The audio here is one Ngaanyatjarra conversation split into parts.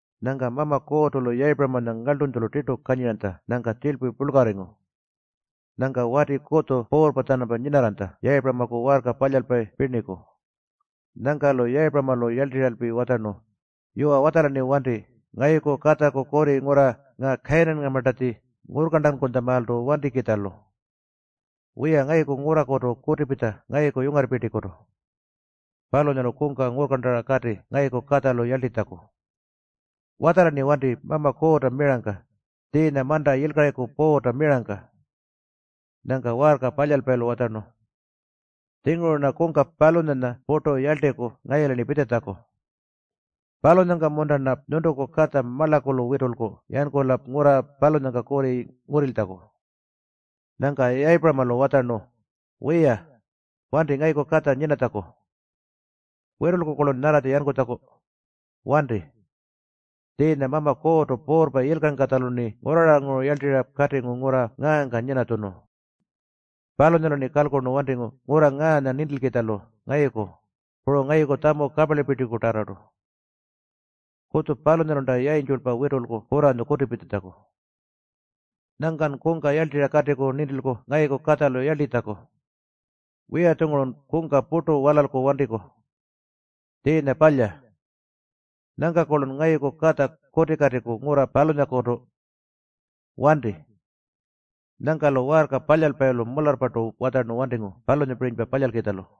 Nyangka Mama Kuurrtu-lu Yayipuramanya ngarltunytjulu tirtu kanyiranytja nyangka tjilpi purlkarringu. Nyangka wati kutju puurrpa-tjanampa nyinarranytja Yayipuramaku waarka palyalpayi pirniku. Nyangka-lu Yayipuramalu yarltirralpi watjarnu, “Yuwa, watjala-rni wanti ngayuku katjaku kurri ngurra ngaa Kayinanngamartatji ngurrkarntankutjamaaltu wantikitjalu. Wiya, ngayuku ngurrakutu kutipitja ngayuku yungarrapirtikutu. Palunyalu kungka ngurrkarntara kati ngayuku katjalu yarltitjaku. Watjala-rni wanti Mama Kuurrta mirangka, tjiinya manta yilkariku Puurrta mirangka.” Nyangka waarka palyalpayilu watjarnu, “Tjinguru-rna kungka palunyanya purtu yarltiku ngayula-rni pitjatjaku. Palunyangka-munta-rna nyuntuku katja marlakulu witulku yankula ngurra palunyangka kurri ngurriltjaku?” Nyangka Yayipuramalu watjarnu, “Wiya, wanti ngayuku katja nyinatjaku. Witulku-kurlun nyarratja yankutjaku. Wanti. Tjiinya Mama Kuurrtu Puurrpa yilkaringkatjalu-rni ngurraranguru yarltirra katingu ngurra ngaangka nyinatjunu. Palunyalu-rni kalkurnu wantingu ngurra ngaanya nintilkitjalu ngayuku, puru ngayuku tjamu kaparlipirtikutarrartu. Kutju-palunyalunta yayintjulpa witulku kurranyu kutipitjatjaku. Nyangkan kungka yarltirra katiku nintilku ngayuku katjalu yarltitjaku. Wiya-tjingurun kungka purtu walalku wantiku. Tjiinya palya. Nyangka-kurlun ngayuku katja kutikatiku ngurra palunyakutu. Wanti.” Nyangka-lu waarka palyalpayilu mularrpartu watjarnu wantingu palunyapirinypa palyalkitjalu.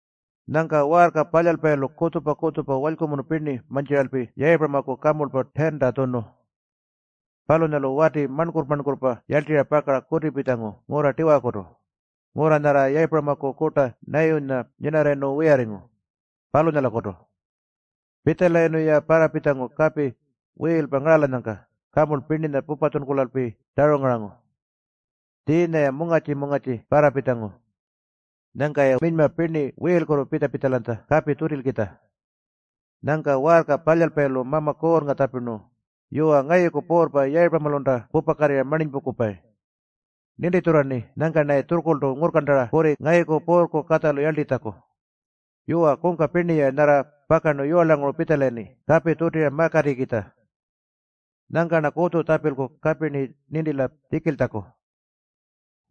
Nyangka waarka palyalpayilu kutjupa-kutjupa walykumunu pirni mantjiralpi Yayipuramaku kamurlpa 10-ta tjunu. Palunyalu wati marnkurr-marnkurrpa yarltirra pakara kutipitjangu ngurra tiwaku, ngurra nyarra Yayipuramaku kurta Nayiyunya nyinarrayirnu wiyarringu, palunyalakutu. Pitjalayirnu-ya parrapitjangu kapi wiilpa ngaralanyangka kamurlpa pirninya pupatjunkulalpi tjarungarangu. Tjiinya-ya mungarrtji-mungarrtji parrapitjangu. Nyangka-ya minyma pirni wiilkutu pitja-pitjalanytja kapi tjutilkitja. Nyangka waarka palyalpayilu Mama Kuurrnga tjapirnu, “Yuwa, ngayuku puurrpa Yayipuramalunta pupakatirra marninypungkupayi. Nintitjurra-rni nyangka-rnayi tjurrkurltu ngurrkarntarra kurri ngayuku puurrku katjalu yarltitjaku. Yuwa, kungka pirni-ya nyarra pakarnu yiwarlanguru pitjalayirni kapi tjutira makatikitja. Nyangka-rna kutju tjapilku, ‘Kapi-rni nintila tjikiltjaku.’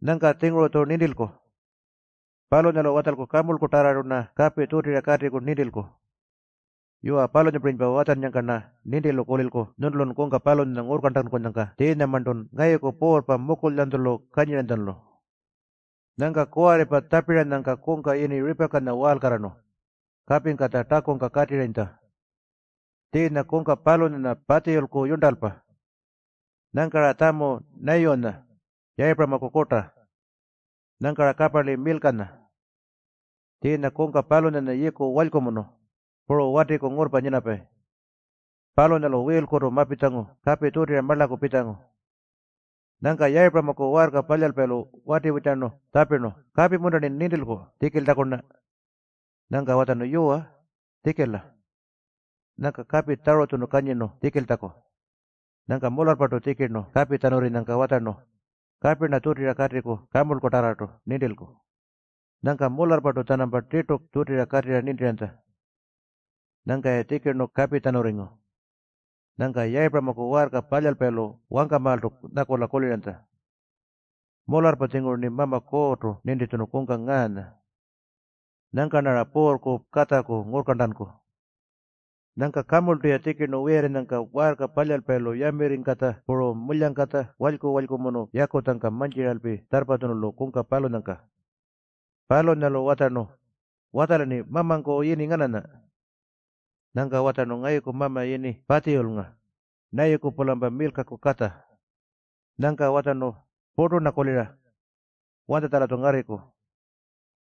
Nyangka tjinguru-tju nintilku. Palunyalu watjalku, ‘Kamurlkutarrartu-rna kapi tjutira katiku nintilku.’ Yuwa, palunyapirinypa watjannyangka-rna nintilu kulilku nyuntulun kungka palunyanya ngurrkarntankunyangka tjiinyamarntun ngayuku puurrpa mukulyanytjulu kanyiranytjalu.” Nyangka kuwarripa tjapiranyangka kungka yini Ripakanya waalkarrarnu, kapingkatja takungka katirrayintja. Tjiinya kungka palunyanya Patjiyulku yurntalpa. Nyangka-ra tjamu Nayiyunya, Yayipuramaku kurta. Nyangka-ra kaparli Milkanya. Tjiinya kungka palunyanya yiiku walykumunu, puru watiku ngurrpa nyinapayi. Palunyalu wiilkutu mapitjangu kapi tjutira marlaku pitjangu. Nyangka Yayipuramaku waarka palyalpayilu watiwirrtjarnu tjapirnu, “Kapi-munta-rnin nintilku tjikiltjaku-rna?” Nyangka watjarnu “Yuwa, tjikila.” Nyangka kapi tjarutjunu kanyirnu tjikiltjaku. Nyangka mularrpartu tjikirnu kapitjanurrinyangka watjarnu, “Kapi-rna tjutira katiku kamurlkutarrartu nintilku.” Nyangka mularrpartu-tjanampa tirtu tjutira katirra nintiranytja. Nyangka-ya tjikirnu kapitjanurringu. Nyangka Yayipuramaku waarka palyalpayilu wangkamaaltu nyakula kuliranytja, “Mularrpa-tjinguru-rni Mama Kuurrtu kungka ngaanya nintitjunu. Nyangka-rnara puurrku katjaku ngurrkarntanku.” Nyangka kamurltu-ya tjikirnu wiyarrinyangka waarka palyalpayilu yamirringkatja puru mulyangkatja walyku-walykumunu yakutjangkatja mantjiralpi tjarrpatjunu-lu kungka palunyangka. Palunyalu watjarnu, “Watjala-rni. Mamanku yini ngananya?” Nyangka watjarnu, “Ngayuku mama yini Patjiyulnga, Nayiyuku-pulampa Milkaku katja.” Nyangka watjarnu, “Purtu-rna kulira. Wanytjatja-latju ngarriku?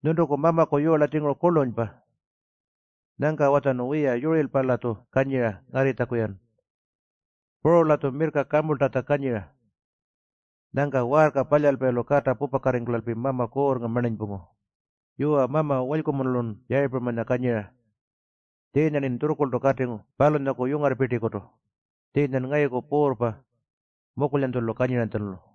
Nyuntuku mamaku yiwarla-tjinguru kurlunypa.” Nyangka watjarnu, “Wiya, yurirlpa-latju kanyira ngarritjaku-yan. Puru-latju mirrka kamurltatja kanyira.” Nyangka waarka palyalpayilu kata pupakatirralpi Mama Kuurrnga marninypungu, “Yuwa Mama, walykumunulun Yayipuramanya kanyira. Tjiinya-rnin tjurrkurltu katingu palunyaku yungarrapirtikutu, tjiinyan ngayuku puurrpa mukulyanytjulu kanyiranytjalu.”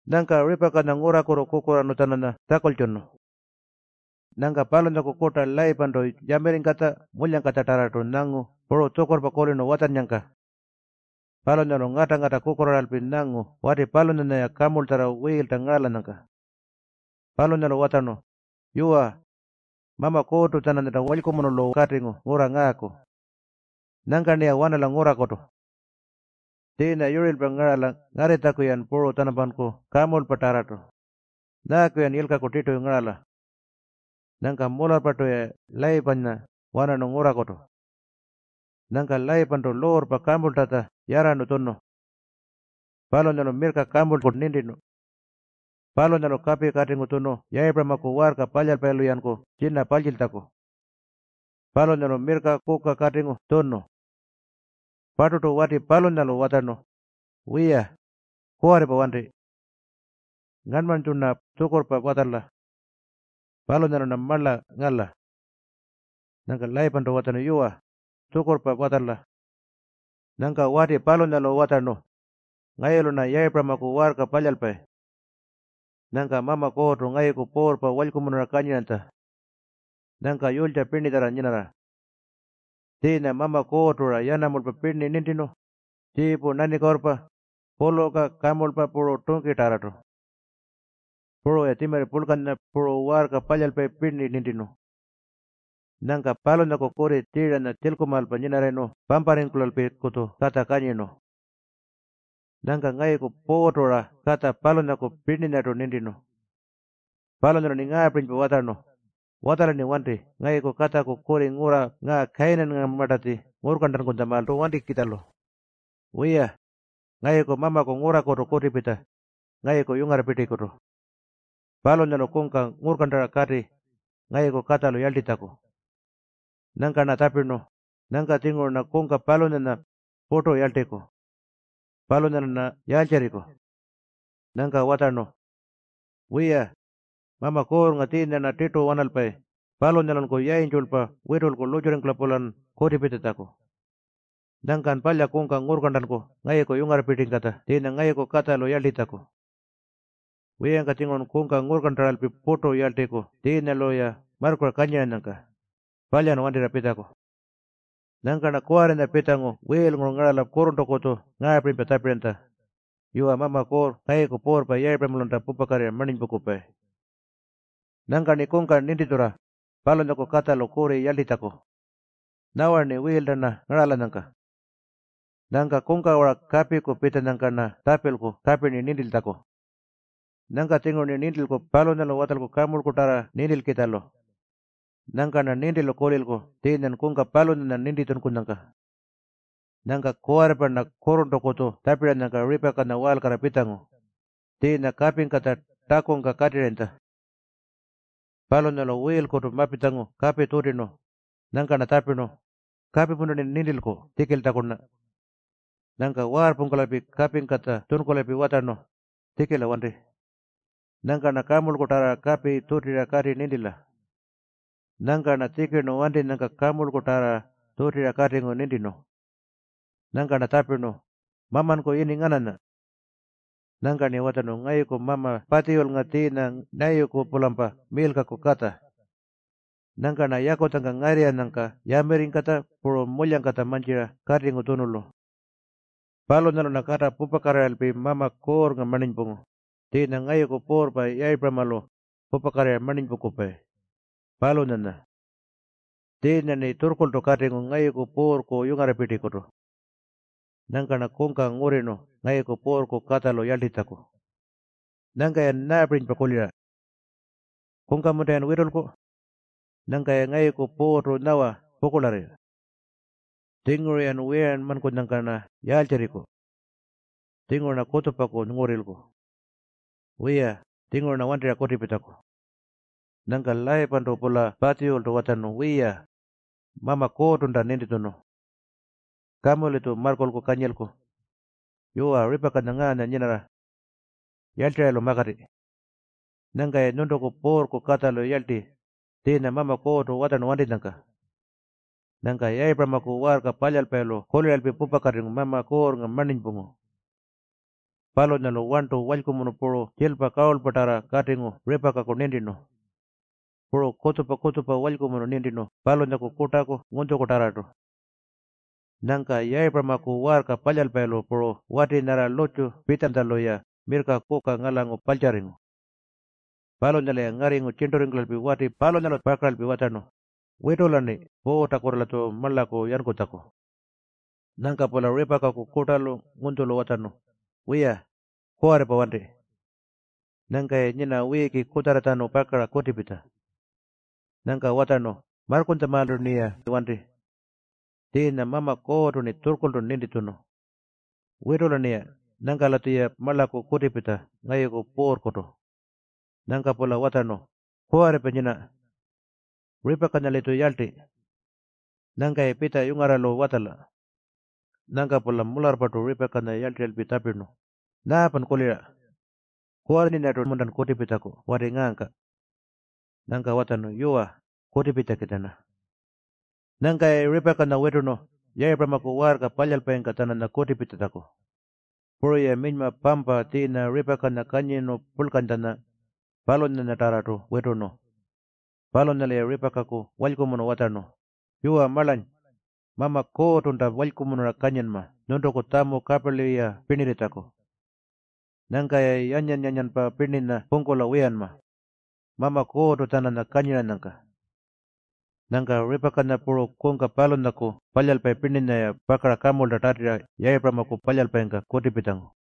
Nyangka Ripakanya ngurrakutu kukurraarnu-tjananya tjakultjunu. Nyangka palunyaku kurta Layipantu yamirringkatja mulyangkatjatarrartu nyangu puru tjukurrpa kulirnu watjannyangka. Palunyalu ngata-ngata kukurraaralpi nyangu wati palunyanya-ya kamurltjarra wiilta ngaralanyangka. Palunyalu watjarnu, “Yuwa, Mama Kuurrtu-tjananyanta walykumunulu katingu ngurra ngaaku. Nyangka-rniya wanala ngurrakutu. Tjiinya yurirlpa ngarala ngarritjaku-yan puru-tjanampanku kamurlpatarrartu. Nyaaku-yan yilkaku tirtu ngarala?” Nyangka mularrpartu-ya Layipannga wanarnu ngurrakutu. Nyangka Layipantu luurrpa kamurltatja yarrarnu tjunu. Palunyalu mirrka kamurlku nintirnu. Palunyalu kapi katingu tjunu Yayipuramaku waarka palyalpayilu-yanku tjina parltjiltjaku. Palunyalu mirrka kuka katingu tjunu. Parturtu wati palunyalu watjarnu, “Wiya, kuwarripa wanti. Ngarnmanytju-rna tjukurrpa watjala. Palunyalu-rna marla ngala.” Nyangka Layipantu watjarnu, “Yuwa, tjukurrpa watjala.” Nyangka wati palunyalu watjarnu, “Ngayulu-rna Yayipuramaku waarka palyalpayi. Nyangka Mama Kuurrtu ngayuku puurrpa walykumunura kanyiranytja. Nyangka yulytja pirnitjarra nyinarra. Tjiinya Mama Kuurrtu-ra yanamulpa pirni nintirnu, tjiipu, nanikuurrpa, puluka, kamurlpa puru tungkitarrartu. Puru-ra tjimarri purlkanya, puru waarka palyalpayi pirni nintirnu. Nyangka palunyaku kurri Tjiiranya tjilkumaalpa nyinarrayirnu pamparringkulalpikutju katja kanyirnu. Nyangka ngayuku puurrtu-ra katja palunyaku pirninyartu nintirnu. Palunyalu-rni ngaapirinypa watjarnu, ‘Watjala-rni wanti ngayuku katjaku kurri ngurra ngaa Kayinanngamartatji ngurrkarntankutjamaaltu wantikitjalu. Wiya, ngayuku mamaku ngurrakutu kutipitja ngayuku yungarrapirtikutu. Palunyalu kungka ngurrkarntara kati ngayuku katjalu yarltitjaku.’ Nyangka-rna tjapirnu, ‘Nyangka-tjinguru-rna kungka palunyanya purtu yarltiku. Palunyalu-rna yaaltjirriku?’ Nyangka watjarnu ‘Wiya, Mama Kuurrnga tjiinya-rna tirtu wanalpayi, palunyalunku yayintjulpa witulku lurrtjurringkula-pulan kutipitjatjaku. Nyangkan palya kungka ngurrkarntanku ngayuku yungarrapirtingkatja tjiinya ngayuku katjalu yarltitjaku. Wiyangka-tjingurun kungka ngurrkarntaralpi purtu yarltiku tjiinya-luya marrkura kanyiranyangka, palyan wantirra pitjaku.’ Nyangka-rna kuwarrinya pitjangu wiilnguru ngarala kurrurntukutju ngaapirinypa tjapiranytja, ‘Yuwa Mama Kuurr, ngayuku puurrpa Yayipuramalunta pupakatirra marninypungkupayi. Nyangka-rni kungka nintitjurra palunyaku katjalu kurri yarltitjaku. Nyawa-rni wiilta-rna ngaralanyangka. Nyangka kungkawara kapiku pitjanyangka-rna tjapilku kapi-rni nintiltjaku. Nyangka tjinguru-rni nintilku palunyalu watjalku kamurlkutarra nintilkitjalu. Nyangka-rna nintilu kulilku tjiinyan kungka palunyanya nintitjunkunyangka.’ Nyangka kuwarripa-rna kurrurntukutju tjapiranyangka Ripakanya waalkarrara pitjangu, tjiinya kapingkatja takungka katirrayintja. Palunyalu wiilkutu mapitjangu kapi tjutirnu. Nyangka-rna tjapirnu, ‘Kapi-munta-rnin nintilku tjikiltjaku-rna?’ Nyangka waarrpungkulalpi kapingkatja tjunkulalpi watjarnu, ‘Tjikila wanti. Nyangka-rna kamurlkutarra kapi tjutira kati nintila.’ Nyangka-rna tjikirnu wantinyangka kamurlkutarra tjutira katingu nintirnu. Nyangka-rna tjapirnu, ‘Mamanku yini ngananya?’ Nyangka-rni watjarnu, ‘Ngayuku mama Patjiyulnga tjiinya Nayiyuku-pulampa Milkaku katja.’ Nyangka-rna yakutjangka ngarrirranyangka yamirringkatja puru mulyangkatja mantjira katingu tjunu-lu. Palunyalu-rna kata pupakatirralpi Mama Kuurrnga marninypungu, tjiinya ngayuku puurrpa Yayipuramalu pupakatirra marninypungkupayi, palunyanya. Tjiinya-rni tjurrkurltu katingu ngayuku puurrku yungarrapirtikutu. Nyangka-rna kungka ngurrirnu ngayuku puurrku katjalu yarltitjaku. Nyangka-yan nyaapirinypa kulira? Kungka-munta-yan witulku? Nyangkayi ngayuku puurrtu nyawa pukurlarri. Tjinguru-yan wiyarnmankunyangka-rna yaaltjirriku? Tjinguru-rna kutjupaku ngurrilku. Wiya-tjinguru-rna wantirra kutipitjaku.” Nyangka Layipantu-pula Patjiyultu watjarnu, “Wiya, Mama Kuurrtunta nintitjunu. Kamu-litju marrkulku kanyilku. Yuwa, Ripakanya ngaanya nyinarra. Yarltirra-lu makati. Nyangkayi nyuntuku puurrku katjalu yarlti, tjiinya Mama Kuurrtu watjarnu wantinyangka.” Nyangka Yayipuramaku waarka palyalpayilu kuliralpi pupakatingu Mama Kuurrnga marninypungu. Palunyalu warntu walykumunu puru tjilpa kawurlpatarrartu katingu Ripakaku nintirnu. Puru kutjupa-kutjupa walykumunu nintirnu palunyaku kurtaku ngunytjukutarrartu. Nyangka Yayipuramaku waarka palyalpayilu puru wati nyarra lurrtju pitjanytjalu-ya mirrka kuka ngalangu parltjarringu. Palunyalu-ya ngarringu tjirnturringkulalpi wati palunyalu pakaralpi watjarnu, “Witula-rni puurrtakutu-latju marlaku yankutjaku.” Nyangka-pula Ripakaku kurtalu ngunytjulu watjarnu, “Wiya, kuwarripa wanti. Nyangkayi nyina wiiki kutjarratjanu pakara kutipitja.” Nyangka watjarnu, “Marrkuntjamaaltu-rniya wanti. Tjiinya Mama Kuurrtu-rni tjurrkurltu nintitjunu. Witula-rniya nyangka-latjuyi marlaku kutipitja ngayuku puurrkutu.” Nyangka-pula watjarnu, “Kuwarripa nyina. Ripakanya-litjuyi yarlti. Nyangkayi pitja yungarralu watjala.” Nyangka-pula mularrpartu Ripakanya yarltirralpi tjapirnu, “Nyaapan kulira? Kuwarrinyartu-muntan kutipitjaku wati ngaangka?” Nyangka watjarnu, “Yuwa, kutipitjakitja-rna.” Nyangka-ya Ripakanya witurnu Yayipuramaku waarka palyalpayingka-tjananya kutipitjatjaku. Puru-ya minyma pampa tjiinya Ripakanya kanyirnu purlkantjanya, palunyanyatarrartu witurnu. Palunyalu-ya Ripakaku walykumunu watjarnu, “Yuwa marlany, Mama Kuurrtunta walykumunura kanyinma nyuntuku tjamu kaparli-ya pirnirritjaku. Nyangka-yayi yanyan-yanyanpa pirninya pungkula wiyanma, Mama Kuurrtu-tjananya kanyiranyangka.” Nyangka Ripakanya puru kungka palunyaku palyalpayi pirninya-ya pakara kamurlta tatira Yayipuramaku palyalpayingka kutipitjangu.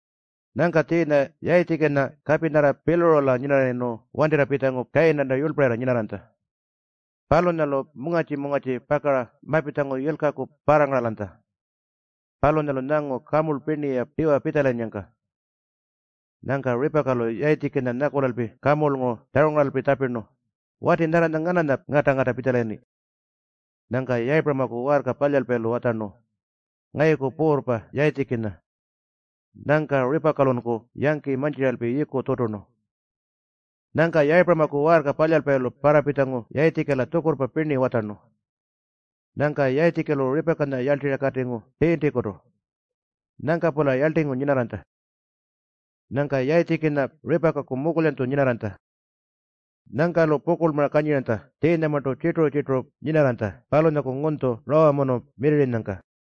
Nyangka tjiinya Yayitjikinya kapi nyarra Piilarula nyinarrayirnu wantirra pitjangu Kayinanta yurlparirra nyinarranytja. Palunyalu mungarrtji-mungarrtji pakara mapitjangu yilkaku parrangaralanytja. Palunyalu nyangu kamurlpa pirni-ya tiwa pitjalayinnyangka. Nyangka Ripakalu Yayitjikinya nyakulalpi kamurlnguru tjarungaralalpi tjapirnu, “Wati nyarranya ngananya ngata-ngata pitjalayirni?” Nyangka Yayipuramaku waarka palyalpayilu watjarnu, “Ngayuku puurrpa Yayitjikinya.” Nyangka Ripakalunku yangki mantjiralpi yiiku tjuturnu. Nyangka Yayipuramaku waarka palyalpayilu parrapitjangu Yayitjikila tjukurrpa pirni watjarnu. Nyangka Yayitjikilu Ripakanya yarltirra katingu tiintikutu. Nyangka-pula yarltingu nyinarranytja. Nyangka Yayitjikinya Ripakaku mukulyanytju nyinarranytja. Nyangka-lu pukurlmara kanyiranytja tjiinyamarntu tjirturu-tjirturu nyinarranytja palunyaku ngunytju rawamunu mirrirrinyangka.